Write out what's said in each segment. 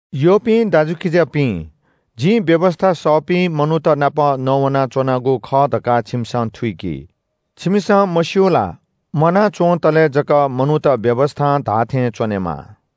यःपिं दाजुकिजापिं, जिं व्‍यवस्‍था सःपिं मनूत नाप नवानाच्‍वनागु खः धकाः छिमिसं थुइकि। छिमिसं मस्‍यू ला? म्‍वाना च्‍वंतले जक मनूत व्‍यवस्‍थां धाःथें च्‍वनेमाः।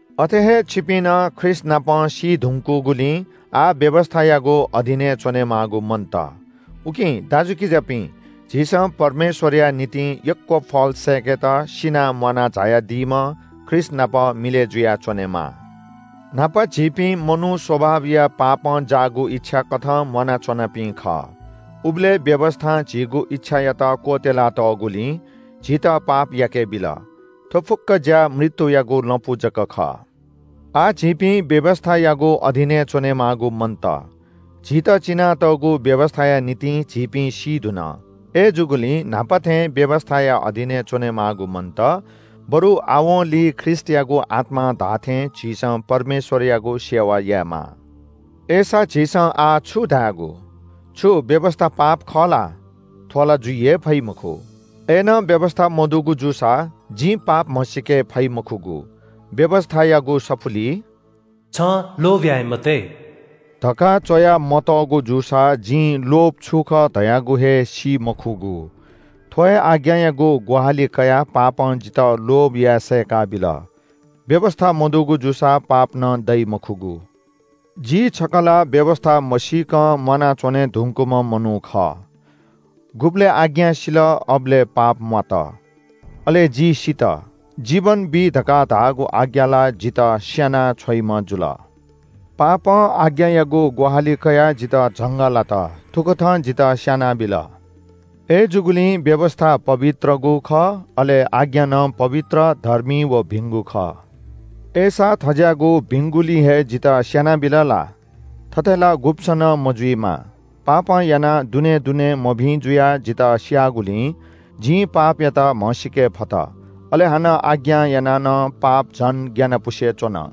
अथे हे छिपिं नं ख्रीष्‍टनापं सी धुंकूगुलिं आः व्‍यवस्‍थायागु अधीनय् च्‍वनेमाःगु मन्‍त। उकिं दाजुकिजापिं, झीसं परमेश्‍वरया निंतिं यक्‍व फल सय्‌केत सिनाः म्‍वाना झायादीम्‍ह ख्रीष्‍टनाप मिलय् जुयाच्‍वनेमाः। न्‍हापा झीपिं मनू स्‍वभाबया पापं जाःगु इच्‍छा कथं म्‍वाना च्‍वनापिं खः। उबलय् व्‍यवस्‍थां झीगु इच्‍छायात क्‍वत्‍यला तःगुलिं झीत पाप याकेबिल। थ्‍व फुक्‍क ज्‍या मृत्‍युयागु लँपु जक खः। आः झीपिं व्‍यवस्‍थायागु अधीनय् च्‍वनेमाःगु मन्‍त। झीत चिनातःगु व्‍यवस्‍थाया निंतिं झीपिं सी धुन। अय्‌जूगुलिं न्‍हापा थें व्‍यवस्‍थाया अधीनय् च्‍वनेमाःगु मन्‍त, बरु आवंलि ख्रीष्‍टयागु आत्‍मां धाःथें झीसं परमेश्‍वरयागु सेवा यायेमाः। अय्‌सा झीसं आः छु धायेगु? छु व्‍यवस्‍था पाप खः ला? थ्‍व ला जुइ हे फइ मखु। अय्‌नं व्‍यवस्‍था मदुगु जूसा जिं पाप म्‍हसीके फइ मखुगु। व्‍यवस्‍थायागु सफुलिइ “छं लोभ याये मते” धकाः च्‍वयामतःगु जूसा जिं लोभ छु खः धयागु हे सी मखुगु। थ्‍व हे आज्ञायागु ग्‍वाहालि कयाः पापं जितः लोभ याये सय्‌का बिल। व्‍यवस्‍था मदुगु जूसा पाप नं दइ मखुगु। जि छकः ला व्‍यवस्‍था मसीकं म्‍वानाच्‍वने धुंकूम्‍ह मनू खः। गुबलय् आज्ञा सिल अबलय् पाप म्‍वात। अले जि सित। जीवन बी धकाः धाःगु आज्ञा ला जितः स्‍याना छ्वइम्‍ह जुल। पापं आज्ञायागु ग्‍वाहालि कयाः जितः झंगः लात। थुकथं जितः स्‍यानाबिल। अय्‌जूगुलिं व्‍यवस्‍था पवित्रगु खः। अले आज्ञा नं पवित्र, धर्मी व भिंगु खः। अय्‌सा थज्‍याःगु भिंगुलिं हे जितः स्‍यानाबिल ला? थथे ला गुब्‍सं नं मजुइमा। पापं यानाः दुनें दुनें मभिं जुयाः जितः स्‍याःगुलिं जिं पापयात म्‍हसीके फत। अले हानं आज्ञां यानाः नं पाप झन ग्‍यानापुसे च्‍वन।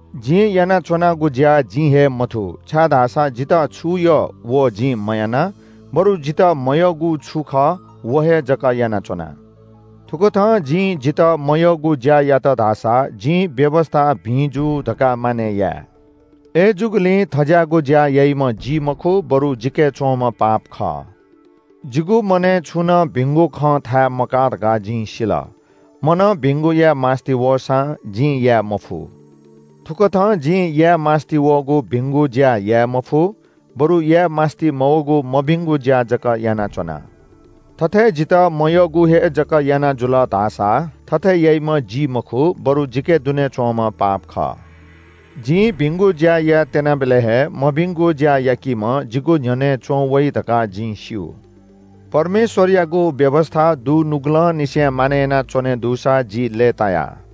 जिं यानाच्‍वनागु ज्‍या जिं हे मथू, छाय्‌धाःसा जितः छु यः व जिं मयाना, बरु जितः मयःगु छु खः व हे जक यानाच्‍वना। थुकथं जिं जितः मयःगु ज्‍या यात धाःसा जिं व्‍यवस्‍था भिं जू धकाः मानय् याये। अय्‌जूगुलिं थज्‍याःगु ज्‍या याइम्‍ह जि मखु, बरु जिके च्‍वंम्‍ह पाप खः। जिगु मनय् छुं नं भिंगु खं थाय् मकाः धकाः जिं सिल। मनं भिंगु याये मास्‍ति वःसां जिं याये मफु। थुकथं जिं याये मास्‍ति वःगु भिंगु ज्‍या याये मफु, बरु याये मास्‍ति मवःगु मभिंगु ज्‍या जक यानाच्‍वना। थथे जितः मयःगु हे जक याना जुल धाःसा थथे याइम्‍ह जि मखु, बरु जिके दुने च्‍वंम्‍ह पाप खः। जिं भिंगु ज्‍या यायेत्‍यनाबलय् हे, मभिंगु ज्‍या याकिम्‍ह जिगु न्‍ह्यःने च्‍वंवइ धकाः जिं स्‍यू। परमेश्‍वरयागु व्‍यवस्‍था दुनुगलंनिसें मानय् यानाच्‍वने दुसा जि लय्‌ताया।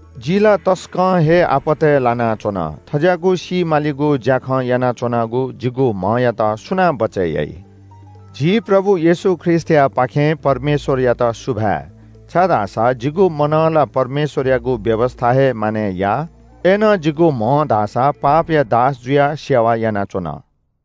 जि ला तसकं हे आपतय् लानाच्‍वन। थज्‍याःगु सी मालिगु ज्‍याखँ यानाच्‍वनागु जिगु म्‍हयात सुनां बचय् याइ? झी प्रभु येशू ख्रीष्‍टयापाखें परमेश्‍वरयात सुभाय्। छाय्‌धाःसा जिगु मनं ला परमेश्‍वरयागु व्‍यवस्‍था हे मानय् याः। अय्‌नं जिगु म्‍हं धाःसा पापया दास जुयाः सेवा यानाच्‍वन।